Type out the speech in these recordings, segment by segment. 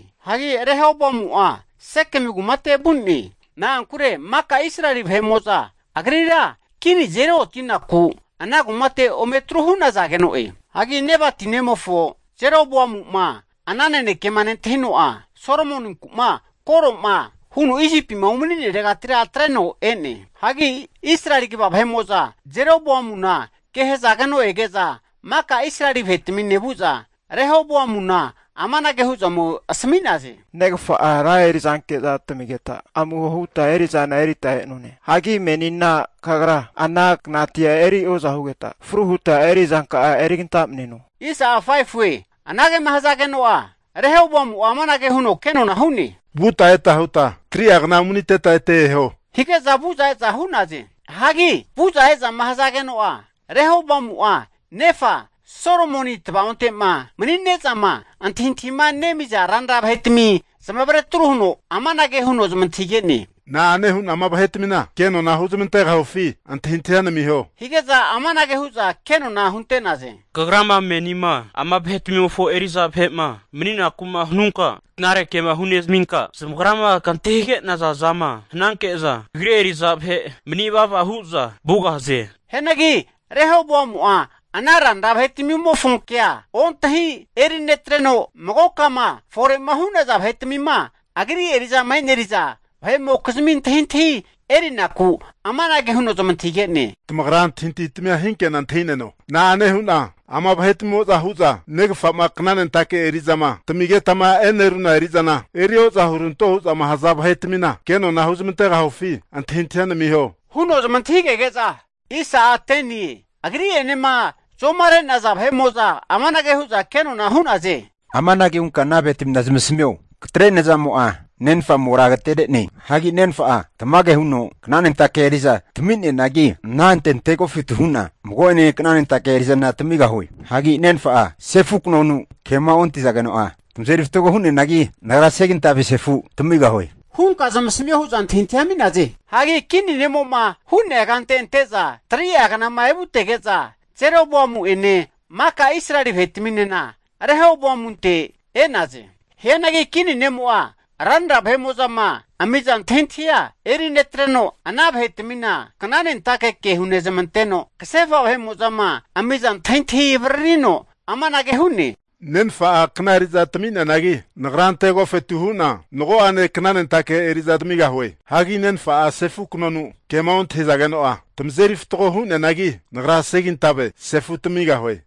Hagi Rehoboamu'a Sekemi kumate vu'ne, na'ankure maka Israeli vahe'mo'za agrira kini azeri oti'naku ana kumate omeri tru hu'nazageno'e. Hagi Nebati nemofo Jeroboamu'ma ana nanekema nentahino'a, Solomoninku'ma koro'ma huno Isipima umani'neregatira atreno e'ne. Hagi Israeli kva vahe'mo'za Jeroboamuna ke hazageno ege'za, maka Israeli vahe'tamine vu'za Rehoboamuna amanage hu'za ome asami'naze, negafa'a ra erizanke'za tamigeta amuho huta eri'zana erita e'none. Hagi menina kagra ana knatia eri oza hugeta fru huta eri'zanka'a erigantamneno. Anagema hazageno'a, Rehoboamu'a amanage huno kenona hu'ne, vuta eta huta 3'a kna umaniteta ete eho, hige'za vu'za e'za hu'naze. Hagi vu'za ezama hazageno'a, Rehoboamu'a nefa Solomoni tavaonte'ma mani'nezama antahintahima nemiza ranra vahetami zamavare atru huno amanage huno zamantahige'ne, na'ane hu'na ama vahetmina kenona huzmantegahufi antahintahia namiho. Hige'za amanage hu'za kenona hunte'naze, Kagrama menima ama vahe'tmimofo eri'za vahe'ma mani'naku'ma hanunka knare kema hunezaminka zamagrama kantahige'naza zama hananke'za kagri eri'za vahe mani vava hu'za vugahaze. Hianagi Rehoboamu'a ana ranra vahetamimofo kea ontahi erinetreno, magokama fore'ma hu'naza vahetmima agri eri'zama e'neriza vahe'mokizmi antahintahi eri'naku, amanage huno zamantahige'ne, Tamagra antahintahitmia hinke'na antahineno. Na'ane hu'na ama vahetmimo'zama hu'za negafa'ma knanentake eri'zama tamigetama e'neruna eri'zana eri oza huranto hu'zama haza vahe'tmina kenona huzmantegahufi antahintahia namiho, huno zamantahigege'za, agri'enema magoka zomare'naza vahe'mo'za amanage hu'za kenona hu'naze, Amanage hunka ana vahe'tmina zamasamio, katre nazamo'a nenfa amora agatere'ne. Hagi nenfa'a tamage huno knanentake eri'za tami'neanagi, anante antegofetu hu'na mago'ane knanentake eri'zana tamigahue. Hagi nenfa'a sefu knonu kema ontahizageno'a tamazeri fatgo hu'neanagi, nagra segintave sefu tamigahue, hunka zamasamio hu'za antahintahia ami'naze. Hagi kini ne'mo'ma hu'nea kante ante'za 3'a knama evutege'za, Jeroboamu'ene maka Israeli vahetaminena Rehoboamunte e'naze. Hianagi kini ne'mo'a ranra vahe'mo'zama amiza antahintahia eri netreno, ana vahetamina knanentake ke hunezamanteno, kasefa vahe'mo'zama amiza antahintahi avaririno amanage hu'ne. Nenfa'a kna eriza tamami'neanagi, nagra anante antegofetu hu'na mago'ane knanentake eri'za tamigahue. Hagi nenfa'a sefu knonu kema ontahizageno'a tamazeri fatgo hu'neanagi, nagra segintave sefu tamigahue.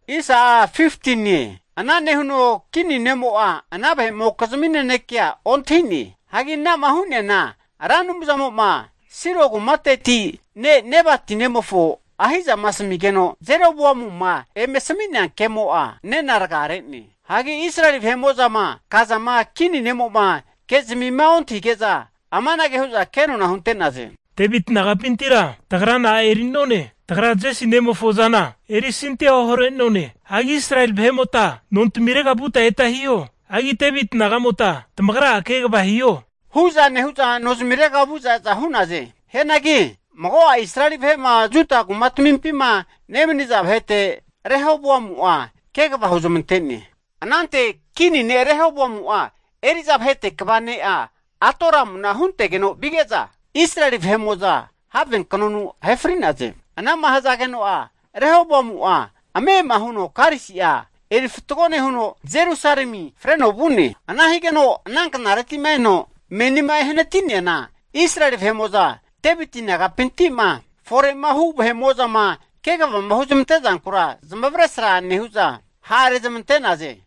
Ana nehuno kini ne'mo'a ana vahe'mokizmi nanekea ontahi'ne. Hagi ana'ma hu'neana Ra Anumzamo'ma Silo kumateti ne' Nebati nemofo Ahi'zama asamigeno Jeroboamuma eme asami'nea kemo'a nena rgare'ne. Hagi Israeli vahe'mo'zama kazama kini ne'mo'ma ke'zimima ontahige'za, amanage hu'za kenona hunte'naze. Deviti nagapintira, tagra na'a eri'none? Tagra Jesi nemofo zana erisantia ohare'none. Hagi Israeli vahemota nontamirega vuta eta hiho. Hagi Deviti nagamota tamagra'a kegava hiho, hu'za nehu'za nozimirega vu'za e'za hu'naze. Hianagi mago'a Israeli vahe'ma Juda kumatamimpima nemaniza vahete Rehoboamu'a kegava huzmante'ne. Anante Kini ne' Rehoboamu'a eri'za vahete kva ne'a Adoramuna huntegeno vige'za Israeli vahe'mo'za havenknonu ahe fri'naze. Ana'ma hazageno'a Rehoboamu'a ame'ama huno karisi'a erifatgo nehuno, Jerusalemi freno vu'ne. Ana higeno ana knareti'ma eno menima ehanati'neana, Israeli vahe'mo'za Deviti nagapinti'ma fore'ma hu'naza vahe'mo'zama kegavama huzmante'zankura zamavaresra nehu'za ha'rezmante'naze.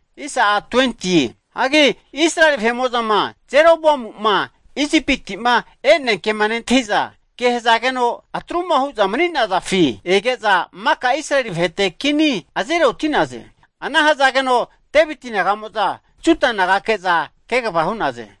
Hagi Israeli vahe'mo'zama Jeroboamu'ma Isipiti'ma e'nea kema nentahi'za, ke hazageno atru'ma hu'za mani'nazafi ege'za, maka Israeli vahete kini azeri oti'naze. Ana hazageno Deviti naga'mo'za Juda nagake'za kegava hu'naze.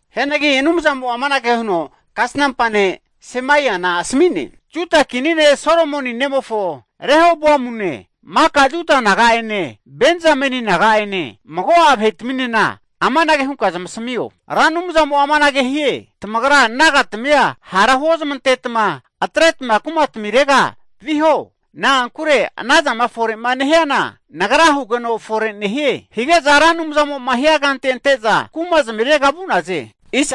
Hianagi Anumzamo'a amanage huno kasnampa ne' Semaiana asami'ne, Juda kini ne' Solomoni nemofo Rehoboamune, maka Juda naga'ene, Benzameni naga'ene mago'a vahetaminena amanage hunka zamasamio, Ra Anumzamo'a amanage hie, tamagra nagatami'a hara huozmantetma atreta kumitmirega viho. Na'ankure anazama fore'ma nehiana Nagra hugeno fore nehie! Hige'za Ra Anumzamo'ma hiankante ante'za kumazmirega vu'naze.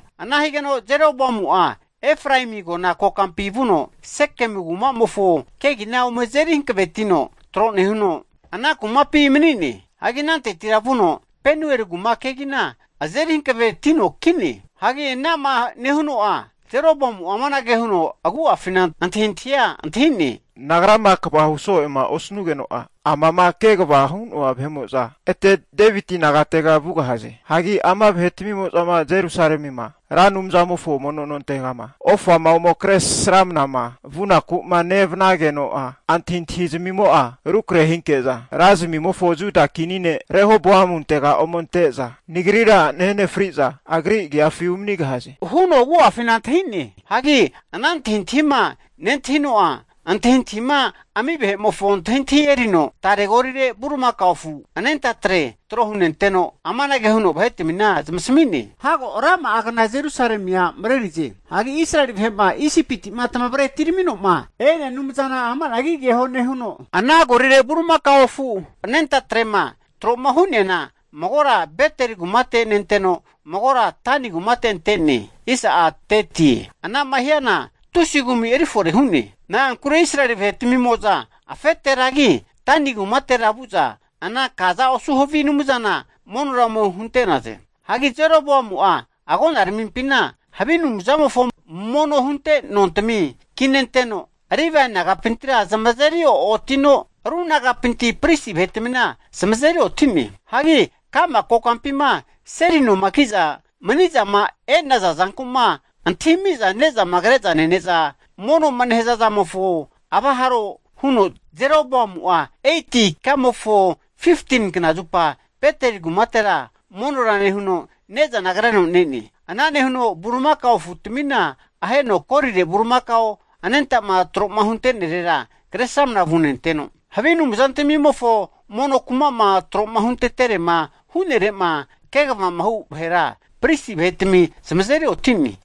Ana higeno Jeroboamu'a Efraemi agona kokampi vuno Sekemu ku'mamofo kegina ome azeri hankavetino tro nehuno, ana kumapi mani'ne. Hagi anantetira vuno Penueli kuma kegina azeri hanavetino ki'ne. Hagi ana'ma nehuno'a, Jeroboamu'a amanage huno agu'afina antahintahia antahi'ne, Nagrama kvahu so'ema osnugeno'a amama kegavama hu'noa vahe'mo'za ete Deviti nagatega vugahaze. Hagi ama vahetamimo'za Jerusalemima Ra Anumzamofo mono nontegama ofama ome kresramnama vunaku'ma nevanageno'a, antahintahi zamimo'a rukrahe hinke'za ra zamimofo Juda kini ne, Rehoboamuntega ome ante'za nagrira nahe fri'za agri agiafi umanigahaze huno agu'afina antahi'ne. Hagi ana antahintahima nentahino'a antahintahima ami vahe'mofo antahintahi erino tare golire bulimaka afu anentatre tro hunenteno, amanage huno vahetmina zamasmi'ne, Hago rama'agna Jerusalemia marerize. Hagi Israeli vahe'ma Isipiti'ma tamavre atiramino'ma e'nea anumzana ama'nagi keho nehuno, ana golire bulimakao afu anentatrema tro'ma hu'neana magora Beteli kumate nenteno, magora Dani kumate ante'ne. Ana'ma hiana tusi kumi erifore hu'ne, na'ankure Israeli vahe'tmimo'za afeteragi, Dani kumatera vu'za ana kaza osu havi anumzana monora ome hunte'naze. Hagi Jeroboamu'a agonaramimpina havi anumzamofo mono hunte nontmina kinenteno, Livae nagapintira zamazeri oranotino, ru nagapinti pristi vahe'tmina zamazeri oti'ne. Hagi ka'ma kokampima seli noma ki'za mani'zama e'naza zanku'ma antahimi'za ne'zama kre'za nene'za mono'ma nehazazamofo avaharo huno Jeroboamu'a 8ti ikamofo 15ni knazupa Beteli kumatera monora nehuno, ne'zana kreno ne'ne. Ana nehuno bulimakao afutamina aheno golire bulimakao anentama troma hunte'nerera Kresramana vunenteno, havi anumzantmimofo mono kuma'ma tro'ma hunteterema hu'nere'ma kegavamahu vahera, pristi vahetami zamazeri oti'ne.